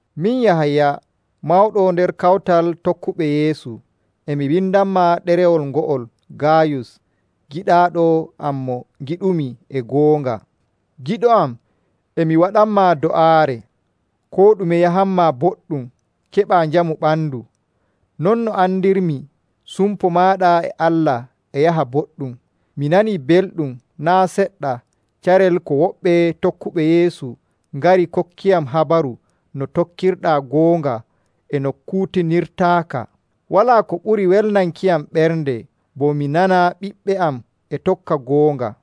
Min Yahaya, mawɗo nder kawtal tokkuɓe Yeesu, e mi windanmaa ɗerewol ngo'ol Gaayus giɗaaɗo am mo ngiɗumi e goonga. Giɗo am, e mi waɗanmaa do'aare koo ɗume yahanmaa boɗɗum keɓaa njamu ɓandu, non no andirmi sumpo maaɗa e Allah e yaha boɗɗum. Mi nanii belɗum naa' seɗɗa carel ko woɓɓe tokkuɓe Yeesu ngari kokkiyam habaru no tokkirɗaa goonga e no kuutinirtaaka. Walaa ko ɓuri welnankiyam ɓernde bo mi nana ɓiɓɓe am e tokka goonga.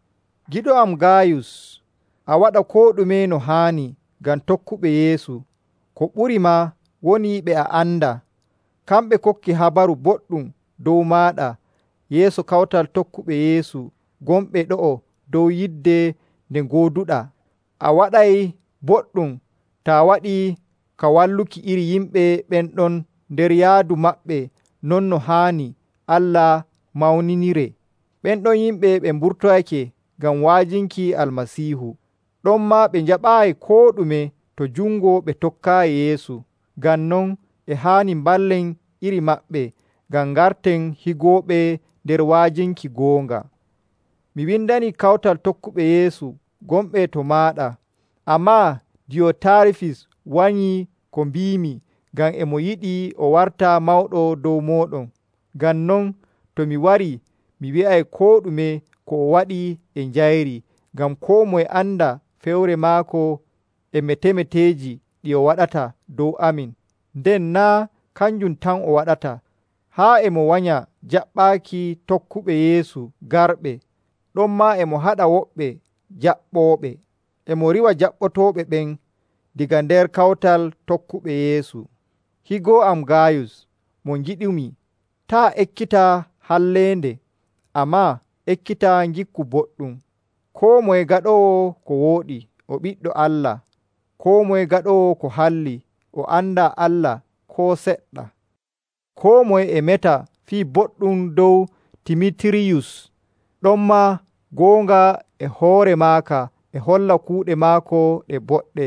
Giɗo am Gaayus, a waɗa koo ɗume no haani ngam tokkuɓe Yeesu, ko ɓuri maa woni ɓe a andaa. Kamɓe kokki habaru boɗɗum dow maaɗa yeeso kawtal tokkuɓe Yeesu gonɓe ɗo'o dow yidde nde ngooduɗaa. A waɗay boɗɗum taa waɗii ka walluki iri yimɓe ɓen ɗon nder yaadu maɓɓe non no haani Allah mawniniree. Ɓen ɗon yimɓe ɓe mburtoyake ngam wa'ajinki Almasiihu, ɗonmaa ɓe njaɓaayi koo ɗume to jungo ɓe tokkaayi Yeesu. Ngam non e haani mballen iri maɓɓe ngam ngarten higooɓe nder wa'ajinki goonga. Mi windanii kawtal tokkuɓe Yeesu gonɓe to maaɗa, ammaa Diyotaarifis wanyii ko mbiimi ngam e mo yiɗi o warta mawɗo dow mooɗon. Ngam non to mi warii, mi wi'ay koo ɗume ko o waɗi e njayri ngam koo moye anda fewre maako e metemeteeji ɗi o waɗata dow amin. Nden naa' kanjum tan o waɗata. Haa e mo wanya jaɓɓaaki tokkuɓe Yeesu garɓe, ɗonmaa e mo haɗa woɓɓe njaɓɓooɓe e mo riiwa jaɓɓotooɓe ɓen daga nder kawtal tokkuɓe Yeesu. Higo am Gaayus mo ngiɗumi, taa' ekkita halleende, ammaa ekkita ngikku boɗɗum. Koo moye gaɗoowo ko wooɗi o ɓiɗɗo Allah. Koo moye gaɗoowo ko halli o andaa Allah koo seɗɗa. Koo moye e meta fii boɗɗum dow Dimitiiriyus. Ɗonmaa goonga e hoore maaka e holla kuuɗe maako ɗe boɗɗe.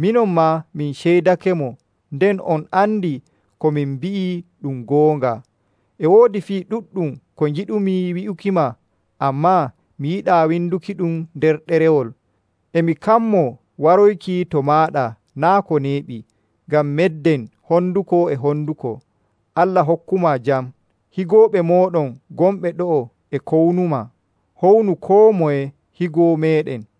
Minon maa min ceydakemo, nden on andi ko min mbi'i ɗum goonga. E woodi fii ɗuɗɗum ko ngiɗumi wi'ukima, ammaa mi yiɗaa windukiɗum nder ɗerewol. E mi kammoo waroyki to maaɗa naa' ko neeɓi, ngam medden honduko e honduko. Allah hokkumaa jam. Higooɓe mooɗon gonɓe ɗo'o e kownumaa. Hownu koo moye higo meeɗen.